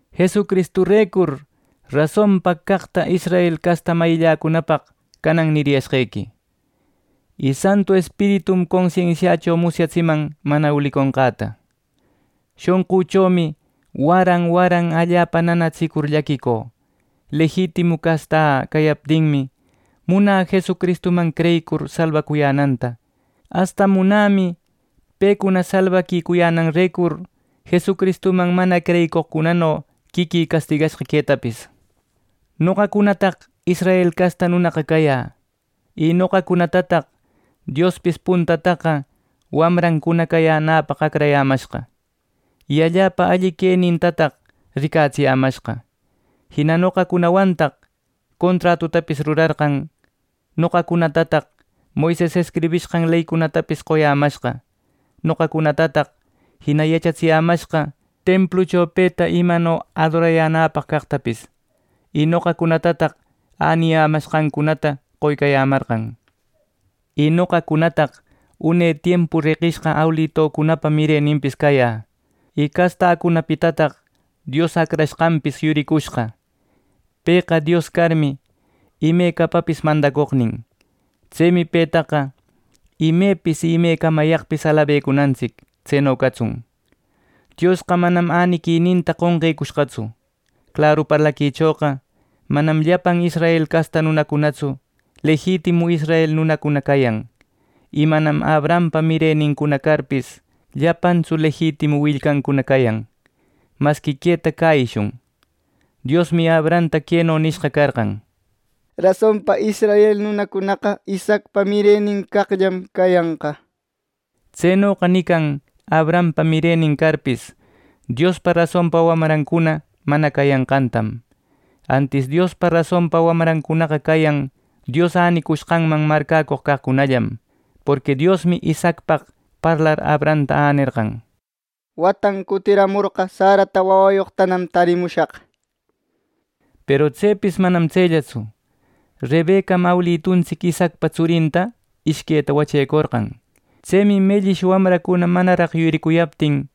Jesucristurecur rasonpa caqta israel casta mayïcunapaq canan niriyashqequi y Santu Espiritum consensiächo musyatsiman mana uliconqäta. Shonqüchomi waran waran allapa nanatsicur llaquicü. Lejitimu castä cayaptinmi, munä Jesucristuman creyicur salbaquicuyänanta, asta munämi pecuna salbaquicuyänanrecur Jesucristuman mana creyicoqcunano quiquï castigashqa quetapis. Noqacunataq israel casta nunaqa cayä y noqacunatataq Diospis puntataqa wamrancuna cayänäpaq acrayämashqa. Y allapa alli quenintataq ricatsiyämashqa. Jina noqacunawantaq contratutapis rurarqan, noqacunatataq Moises escribishqan leycunatapis qoyämashqa. Noqacunatataq jina yachatsiyämashqa templucho peta imano adorayänäpaq caqtapis. Y noqacunatataq äniyanqancunata qoycayämarqan. Y noqacunataq une tiempu reqishqa awilitucunapa mireninpis cayä y castäcunapitataq Dios Acrashqanpis yuricushqa. Pëqa Dios carmi, imecapapis mandacoqnin. Tsemi petaqa ¡imepis y imecamayaqpis alabecunantsic! ¡Tseno catsun! Diosqa manam äniquininta qonqecushqatsu. Claru parlaquichoqa manam llapan Israel casta nunacunatsu lejitimu israel nunacuna cayan. Y manam Abrahampa mirenincuna carpis, llapantsu lejitimu willcancuna cayan. Masqui queta cäyishun, Diosmi Abrahamta queno nishqa carqan: “Rasonpa israel nunacunaqa Isaacpa mirenin caqllan cayanqa” nir. Tsenoqa nican Abrahampa mirenin carpis Diospa rasonpa wamrancuna mana cayanqantam, antis Diospa rasonpa wamrancunaqa cayan Dios änicushqanman marcäcoq caqcunallam. Porqui Diosmi Isaacpaq parlar Abrahamta änerqan: “watan cutiramorqa Sarata wawayoqtanam tarimushaq” nir. Peru tsepis manam tsellatsu. Rebecam awilituntsic Isaacpa tsurinta ishqueta wachecorqan. Tsemi mellish wawancuna manaraq yuricuyaptin,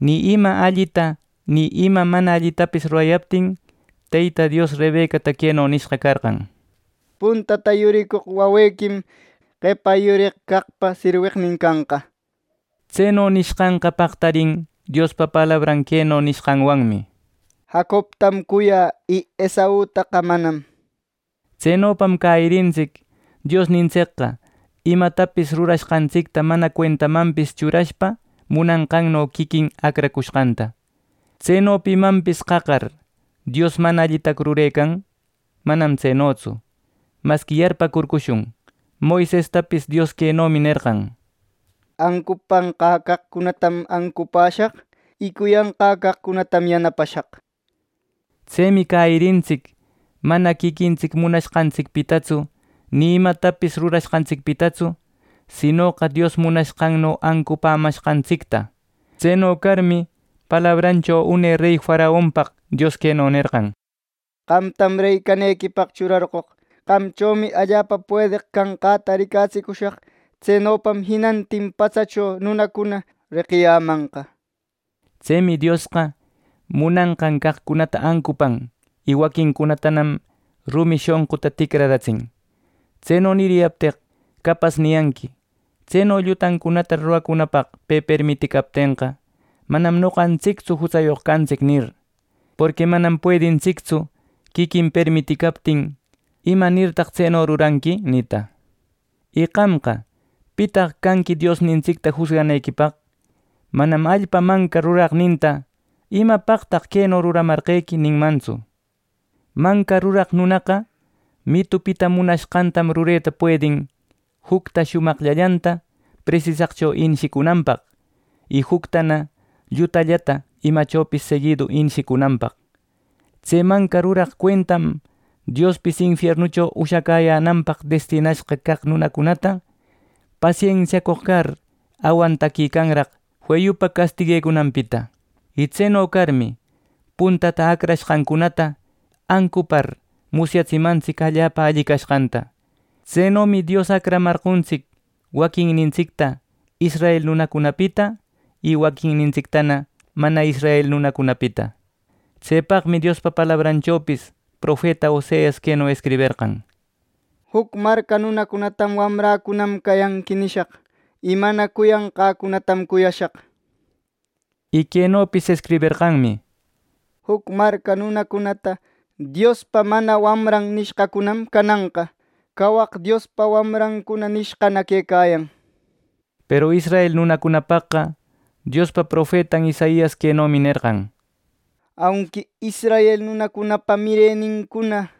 ni ima allita ni ima mana allitapis rurayaptin, Teyta Dios Rebecata queno nishqa carqan: “Puntata yuricoq wawequim qepa yureq caqpa sirweqnin canqa” nir. Tseno nishqanqa paqtarin, Diospa palabran queno nishqanwanmi: “Jacobtam cuyä y Esautaqa manam” nenqan. (Tsenopam cäyirintsic Diosnintsicqa imatapis rurashqantsicta mana cuentamanpis churashpa munanqanno quiquin acracushqanta.) Tseno pimanpis qaqar ¿Dios mana allitacu rurecan? Manam tsenotsu. Masqui yarpäcurcushun: Moisestapis Dios quenomi nerqan: “Ancupanqä caqcunatam ancupäshaq, y cuyanqä caqcunatam yanapashaq” nir. Tsemi cäyirintsic mana quiquintsic munashqantsicpitatsu ni imatapis rurashqantsicpitatsu, sinoqa Dios munanqanno ancupämashqantsicta. Tseno carmi, palabrancho une rey faraonpaq Dios queno nerqan: “Qamtam, rey canequipaq churarqoq. Qamchomi allapa puedeq canqäta ricatsicushaq; tsenopa jinantin patsacho nunacuna reqiyamanqa” nir. Tsemi Diosqa munanqan caqcunata ancupan, y waquincunatanam rumi shonquta ticraratsin. Tseno niriyapteq, capas niyanqui, “Tseno llutancunata ruracunapaq pe permiticaptenqa, manam noqantsictsu jutsayoq cantsic” nir, porqui manam puedintsictsu quiquin permitiquicaptin “imanirtaq tseno ruranqui” nita. Y qamqa, ¿pitaq canqui Diosnintsicta jusganequipaq? Manam allpa manca, ruraqninta “¿Imapaqtaq queno ruramarqequi!” ninmantsu. Manca ruraq nunaqa mitupita munashqantam rureta puedin jucta shumaqllallanta presisaqllacho inishicunanpaq, y juctana llutallata imachopis seguidu inishicunanpaq. Tse manca ruraq cuentam Diospis infiernucho ushacäyänanpaq destinashqa caq nunacunata, pasensiacoq car awantaquicanraq feyupa castiguecunanpita. Y tseno carmi, puntata acrashqancunata ancupar, musyatsimantsic allapa alli cashqanta. Tsenomi Dios acramarqontsic waquinnintsicta israel nunacunapita y waquinnintsictana mana israel nunacunapita. Tsepaqmi Diospa palabranchopis profeta Oseas queno escriberqan: “Juc marca nunacunatam, ‘Wamräcunam cayanqui’ nishaq, y mana cuyanqäcunatam cuyashaq” nir. Y quenopis escriberqanmi: “Juc marca nunacunata, Diospa mana wamran nishqacunam cananqa ‘Cawaq Diospa wamrancuna’ nishqana quecayan” nir. Peru israel nunacunapaqqa Diospa profetan Isaias quenomi nerqan: “Aunqui israel nunacunapa mirenincuna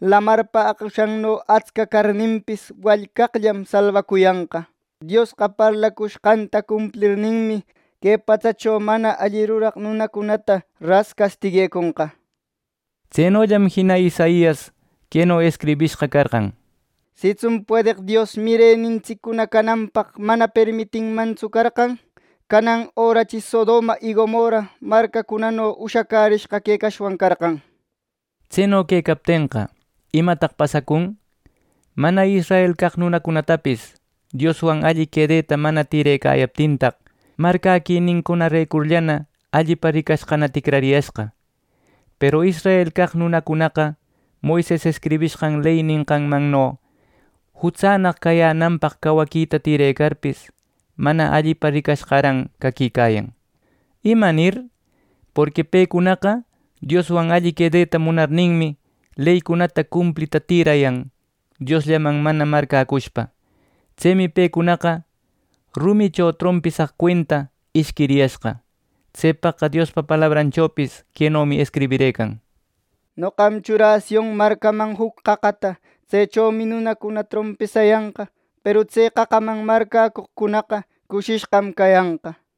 lamarpa aqushanno atsca carninpis, wallcaqllam salbacuyanqa. Diosqa parlacushqanta cumplirninmi que patsacho mana alli ruraq nunacunata ras castigueconqa” nir. Tsenollam jina Isaias queno escribishqa carqan: “Sitsun puedeq Dios mirenintsiccuna cananpaq mana permitinmantsu carqan, canan örachi Sodoma y Gomorra marcacunano ushacashqa quecashwan carqan” nir. Tseno quecaptenqa, ¿imataq pasacun? ¡Mana israel caq nunacunatapis Dioswan alli quedeta mana tïrecayaptintaq, marcäquinincunarecurllana allipa ricashqana ticrariyashqa! Peru israel caq nunacunaqa Moises escribishqan ley nishqanmanno jutsannaq cayänanpaq cawaquita tirecarpis, mana allipa ricashqaran caquicayan. ¿Imanir? Porqui pecunaqa Dioswan alli quedeta munarninmi, leycunata cumplita tïrayan Diosllaman mana marcäcushpa. Tsemi pecunaqa rumicho trompisaq cuenta ishquiriyashqa. Tsepaqqa Diospa palabranchopis quenomi escribirëcan: “Noqam churä Sion marcaman juc qaqata. Tsechomi nunacuna trompisayanqa. Peru tse qaqaman marcäcoqcunaqa cushishqam cayanqa” nir.